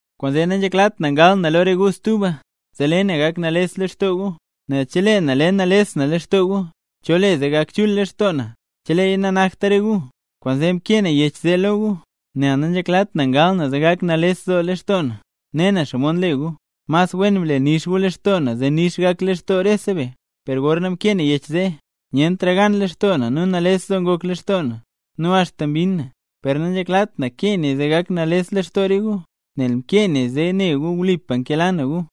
Kwaanzee nanzheklat na ngal na lo re gu stuba, zee le na gak nales lextoo gu. Nel chelee na le nales na lextoo gu, ¿cho le zee gak chul lextoo na, cheleeya nanakta re gu? Kwaanzee mkee na yech zee lo gu, nel nanzheklat na ngal na zee gak nales lextoo na, ne na xomod nle gu. Mas wen ble nix gu lextoo na zee nix gak lextoo rese be. Per gorna mkee na yech zee, nyentra gan lextoo na nu nales doo ngok lextoo na, nu axta mbinn na. Per nanzheklat na kee naya zee gak nales lextoo re gu, nel mkee naya zee ne gu wlipa nkela na gu.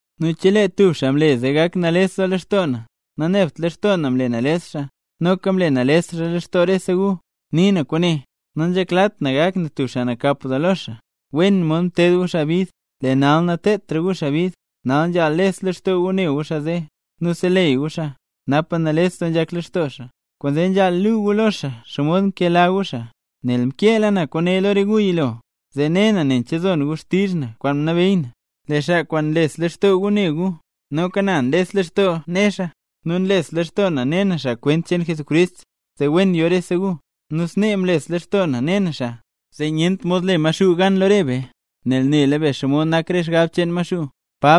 Nu chelee tub xaa mle zee ngok nales lextoo na, nanebt lextoo na mle nales xaa, noka mle nales xaa lextoo rese gu. Nii na kwaane: Nanzheklat na gak na tub xaa nakap doo lo xaa. Wen mod mted gu xaa bid, lee nal natedtra gu xaa bid. Nal nzhaal les lextoo gu ne gu xaa zee, nu seleyy gu xaa, napa nales doo nzhak lextoo xaa. Kwaanzee nzhaal luu gu lo xaa xomod nkela gu xaa. Nel mkeela na kwaane lo re gu yilo, zee ne na nen che zon gu xtizh na kwaan mnabeey na. Lee xaa kwaan nles lextoo gu ne gu, noka na nles lextoo ne xaa. Nu nles lextoo na ne na xaa kwent cheen Jesucrist, zee wen yo rese gu. Nu snee mles lextoo na ne na xaa, zee nyent mod le Maxuu gan lo re be, nel nela be xomod nak re xgab cheen Maxuu.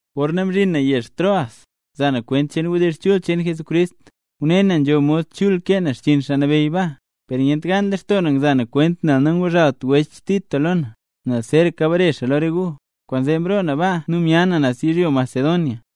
Gorna mzhin na yezh Troas, za na kwent cheen wdizh chul cheen Jesucrist, ngune na nzho mod chul kee na xchiin Xaa Nabeyy baa. Per nyent gan lextoo na ngza na kwent nel nanguzhalt wech Tito lo na, nel zeeraka bare xaa lo re gu. Kwaanzee mroo na baa nu mya na naz yizhyo Macedonia.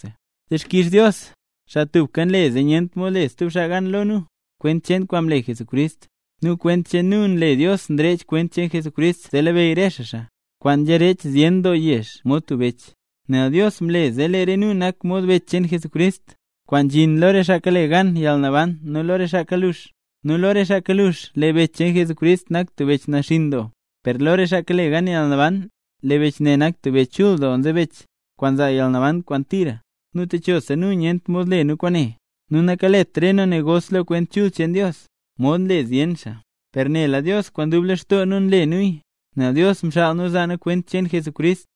¡Dixkix Dios, xaa tubka nle zee nyent mod le stub xaa gan lo nu, kwent cheen kwaan mle Jesucrist! Nu kwent cheen nu nle Dios nrech kwent cheen Jesucrist zee labeyy re xaa xaa, kwaan nzharech zyen doo yezh mod tub bech; nel Dios mle zee lee re nu nak mod bech cheen Jesucrist, kwaan nzhin lo re xaa kale gan yalnaban nu lo re xaa kalux. Nu lo re xaa kalux, lee bech cheen Jesucrist nak tub bech naxinn doo; per lo re xaa kale gan yalnaban, lee bech ne nak tub bech chul doo nzebech, kwaan nzaa yalnaban kwaan tira. Nu techosa nu nyent mod le nu kwaane. Nu nakalet re nu negos lo Kwent Chul cheen Dios, modxa nle zyen xaa; per nela Dios, kwaan dub lextoo nu nle nuya, nel Dios mxaal nu zaa nu kwent cheen Jesucrist.